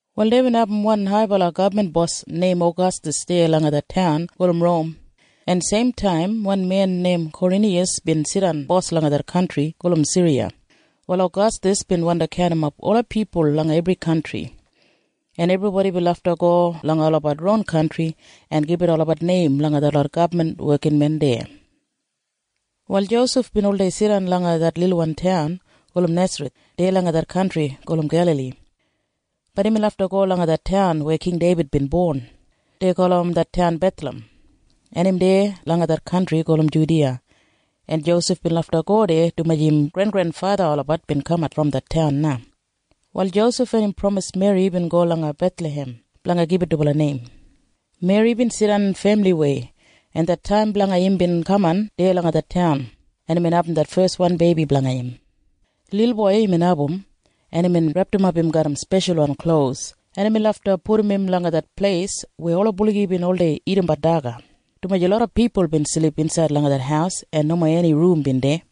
Wal deibin abum wan haibala gabman bos neim Agastas deya langa det taun gulum Rom, en seimtaim wan men neim Kwariniyas bin jidan bos langa det kantri gulum Siriya. Wal Agastas bin wandi kaundimap ola pipul langa ebri kantri, en ebribodi bin lafta go langa olabat ron kantri en gibit olabat neim langa detlot gabman wekinmen deya. Wal Josef bin oldei jidan langa det lilwan taun gulum Nesareth deya langa det kantri gulum Gelali. Bat imbin lafta go langa det taun weya King Deibid bin bon. Dei gulum det taun Bethlahem, en im deya langa det kantri gulum Judiya, en Josef bin lafta go deya dumaji im grengrenfatha olabat bin kamat brom det taun na. Wal Josef en im pramis Meri bin go langa Bethlahem blanga gibit dubala neim. Meri bin jidan femiliwei, en det taim blanga im bin kaman deya na langa det taun, en imbin abum det feswan beibi blanga im. Lilboi imbin abum, en imbin repdimap im garram speshalwan klos, en imbin lafta pudum im langa det pleis weya ola buligi bin oldei dagadagat daga, dumaji loda pipul bin silip insaid langa det haus en nomo eni rum bin deya.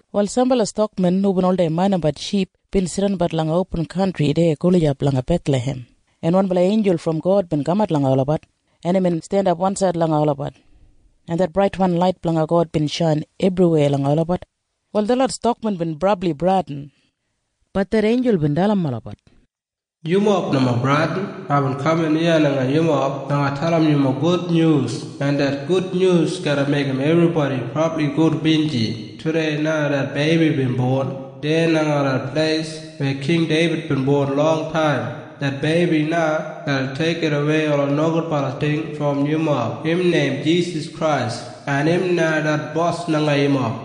Wal sambala stakmen hubin oldei maindimbat ship bin jidanbat langa opin kantri deya gulijap langa Bethlahem, en wanbala einjul brom God bin kamat langa olabat, en imbin jandap wansaid langa olabat, en det braitwan lait blanga God bin shain ebriweya langa olabat. Wal detlot stakmen bin brabli bradin. Bat det einjul bin dalim olabat, “Yumob nomo bradin. Aibin kaman iya langa yumob blanga dalim yumob gudnyus, en det gudnyus garra meigim ebribodi brabli gudbinji. Tudei na det beibi bin bon deya langa det pleis weya King Deibid bin bon longtaim. Det beibi na garra deigidawei ola nogudbala ting brom yumob. Im neim Jisas Krais, en im na det Bos blanga yumob.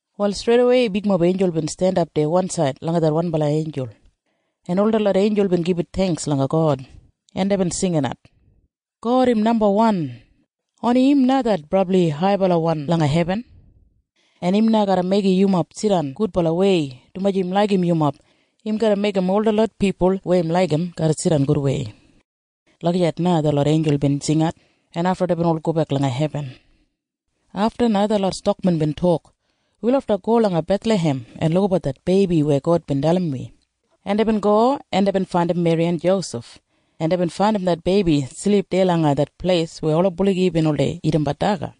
Wal streidawei bigmob einjul bin jandap deya wansaid langa det wanbala einjul, en ol detlot einjul bin gibit theingks langa God, en deibin jinginat, “God im nambawan! Oni im na det brabli haibalawan langa hebin. En im na garra meigim yumob jidan gudbalawei, dumaji im laigim yumob. Im garra meigim ol detlot pipul weya im laigim garra jidan gudwei.” Lagijat na detlot einjul bin jingat, en afta deibin ol gobek langa hebin. Afta na detlot stakmen bin tok, “Wi lafta go langa Bethlahem en lukabat det beibi weya God bin dalim wi.” En deibin go, en deibin faindim Meri en Josef, en deibin faindim det beibi silip deya langa det pleis weya ola buligi bin oldei dagadagat daga.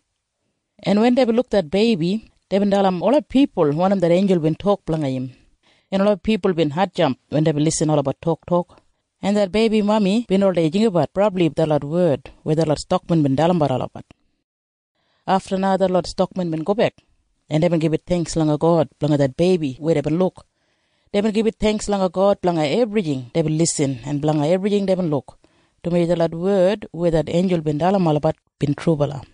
En wen deibin luk det beibi, deibin dalim ola pipul wanim det einjul bin tok blanga im, en ola pipul bin hatjamp wen deibin irrim olabat toktok, en det beibi mami bin oldei jinggabat brabli detlot wed weya detlot stakmen bin dalimbat olabat. Afta na detlot stakmen bin gobek, en deibin gibit theingks langa God blanga det beibi weya deibin luk. Deibin gibit theingks langa God blanga ebrijing deibin irrim en blanga ebrijing deibin luk, dumaji detlot wed weya det einjul bin dalim olabat bin trubala.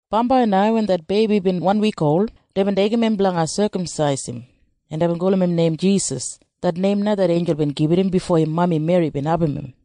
Bambai na wen det beibi bin wan wik ol, deibin deigim im blanga sekamsais im, en deibin gulum im neim Jisas. Det neim na det einjul bin gibit im bifo im mami Meri bin abum im.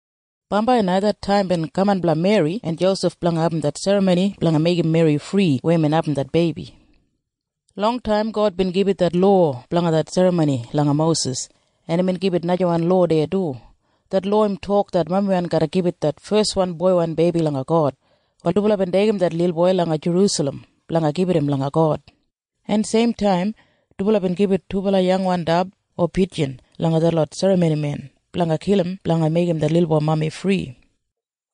Bambai na det taim bin kaman blanga Meri en Josef blanga abum det serramoni blanga meigim Meri fri weya imbin abum det beibi. Longtaim God bin gibit det lowa blanga det serramoni langa Mosis. En imbin gibit najawan lowa deya du. Det lowa im tok det mamiwan garra gibit det feswan boiwan beibi langa God. Wal dubala bin deigim det lilboi langa Jerusalem blanga gibit im langa God, en seimtaim dubala bin gibit dubala yangwan dab o pijin langa detlot serramonimen blanga kilim blanga meigim det lilboi mami fri.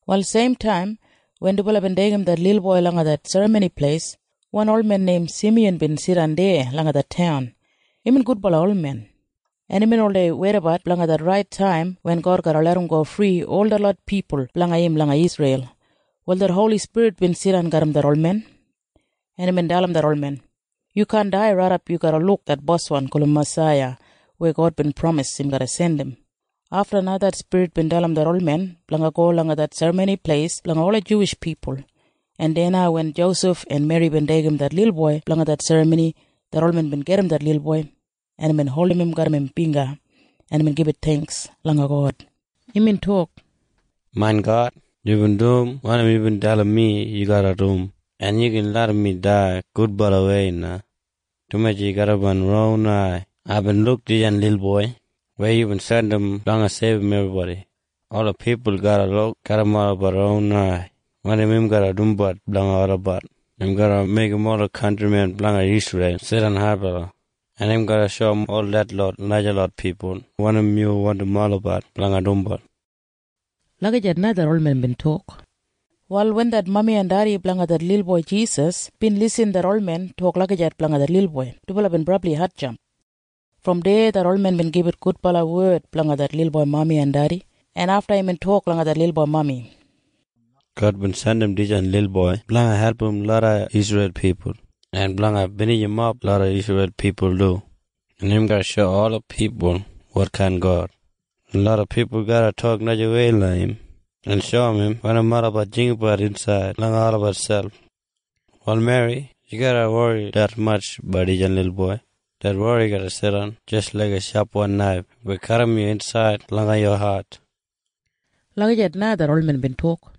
Wal seimtaim wen dubala bin deigim det lilboi langa det Serramoni Pleis, wan olmen neim Simiyan bin jidan deya langa det taun. Imbin gudbala olmen, en imbin oldei weidabat blanga det rait taim wen God garra larramgo fri ol detlot pipul blanga im langa Isreil. Wal det Holi Spirit bin jidan garram det olmen, en imbin dalim det olmen, “Yu kaan dai raidap yu garra luk det Boswan gulum Masaiya weya God bin pramis im garra jandim.” Afta na det Spirit bin dalim det olmen blanga go langa det Serramoni Pleis blanga ola Juwish pipul, en deya na wen Josef en Meri bin deigim det lilboi blanga det serramoni, det olmen bin gajim det lilboi, en imbin holdim im garram im bingga, en imbin gibit theingks langa God. Imbin tok, “Main God, yubin dum wanim yubin dalim mi yu garra dum, en yu gin larram mi dai gudbalawei na, dumaji garram main ron ai aibin luk dijan lilboi weya yubin jandim blanga seibum ebribodi. Ola pipul garra luk garram olabat ron ai wanim im garra dumbat blanga olabat. Im garra meigim ola kantrimen blanga Isreil jidan haibala, en im garra shoum ol detlot najalot pipul wanim yu wandim olabat blanga dumbat.” Lagijat na det olmen bin tok. Wal wen det mami en dedi blanga det lilboi Jisas bin lisin det olmen tok lagijat blanga det lilboi, dubala bin brabli hatjamp. Brom deya det olmen bin gibit gudbala wed blanga det lilboi mami en dedi, en afta imbin tok langa det lilboi mami, “God bin jandim dijan lilboi blanga album loda Isreil pipul en blanga binijimap loda Isreil pipul du. Im garra shoum ola pipul wotkain God. En loda pipul garra tok najawei langa im en shoum im wanim olabat jinggabat insaid langa olabat selp. “Wal Meri, yu garra wori detmatj blanga dijan lilboi. Det wori garra jidan jis laiga shapwan naif weya kadim yu insaid langa yu hat.” Lagijat na det olmen bin tok.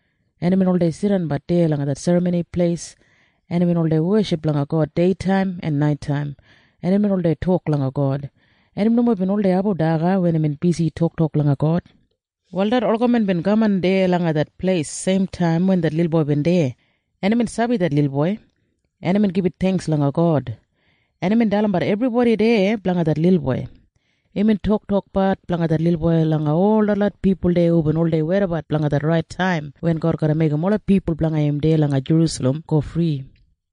En imbin oldei jidanbat deya langa det Serramoni Pleis, en imbin oldei weship langa God deitaim en naitaim, en imbin oldei tok langa God, en im nomo bin oldei abum daga wen imbin bisi toktok langa God. Wal det olgamen bin kaman deya langa det pleis seimtaim wen det lilboi bin deya, en imbin sabi det lilboi, en imbin gibit theingks langa God, en imbin dalimbat ebribodi deya blanga det lilboi. Imbin toktokbat blanga det lilboi langa ol detlot pipul deya hubin oldei weidabat blanga det rait taim wen God garra meigim ola pipul blanga im deya langa Jerusalem go fri.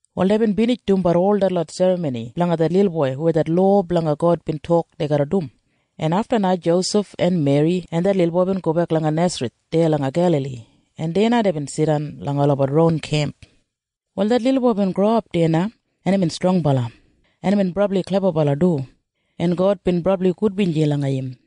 Wal deibin binij dumbat ol detlot serramoni blanga det lilboi weya det lowa blanga God bin tok dei garra dum, en afta Josef en Meri en det lilboi bin gobek langa Nesareth deya langa Gelali, en deya na deibin jidan langa olabat ron kemp. Wal det lilboi bin growap deya na, en imbin strongbala, en imbin brabli klebabala du, en God bin brabli gudbinji langa im.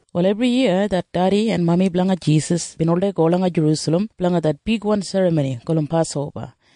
Wal ebriyiya det dedi en mami blanga Jisas bin oldei go langa Jerusalem blanga det bigwan serramoni gulum Pasoba,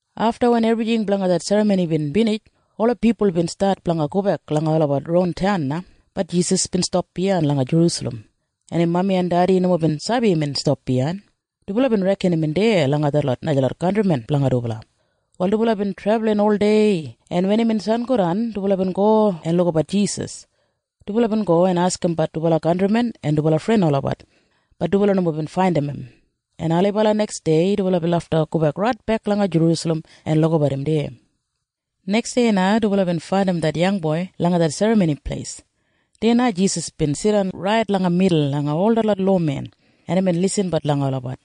Afta wen ebrijing blanga det serramoni bin binij, ola pipul bin stat blanga gobek langa olabat ron taun na. Bat Jisas bin stap biyain langa Jerusalem. En im mami en dedi nomo bin sabi imbin stap biyain. Dubala bin reken imbin deya langa detlot najalot kantrimen blanga dubala. Wal dubala bin trebulin oldei, en wen imbin sangodan, dubala bin go en lukabat Jisas. Dubala bin go en askimbat dubala kantrimen en dubala fren olabat. Bat dubala nomo bin faindim im, en ailibala neksdei dubala bin lafta gobek raitbek langa Jerusalem en lukabat im deya. Neksdei na dubala bin faindim det yangboi langa det Serramoni Pleis. Deya na Jisas bin jidan rait langa midul langa ol detlot lowamen, en imbin lisinbat langa olabat,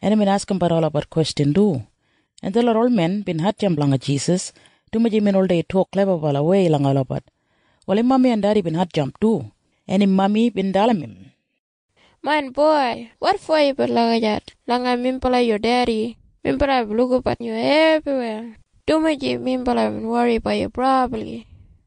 en imbin askimbat olabat kwestjan du, en ebribodi deya bin hatjamp langa Jisas, dumaji imbin oldei tok klebabalawei langa olabat. Wal im mami en dedi bin hatjamp du, en im mami bin dalim im, “Main boi, wotfo yubin lagijat langa minbala yu dedi? Minbala bin lukabat yu ebriweya, dumaji minbala bin wori blanga yu brabli.”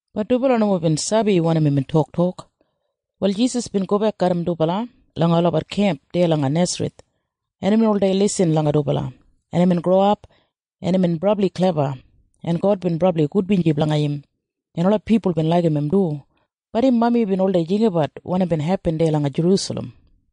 Bat dubala nomo bin sabi wanim imbin toktok. Wal Jisas bin gobek garram dubala langa olabat kemp deya langa Nesareth, en imbin oldei lisin langa dubala, en imbin growap, en imbin brabli klebawan, en God bin brabli gudbinji blanga im, en ola pipul bin laigim im du. Bat im mami bin oldei jinggabat wanim bin hepin deya langa Jerusalem.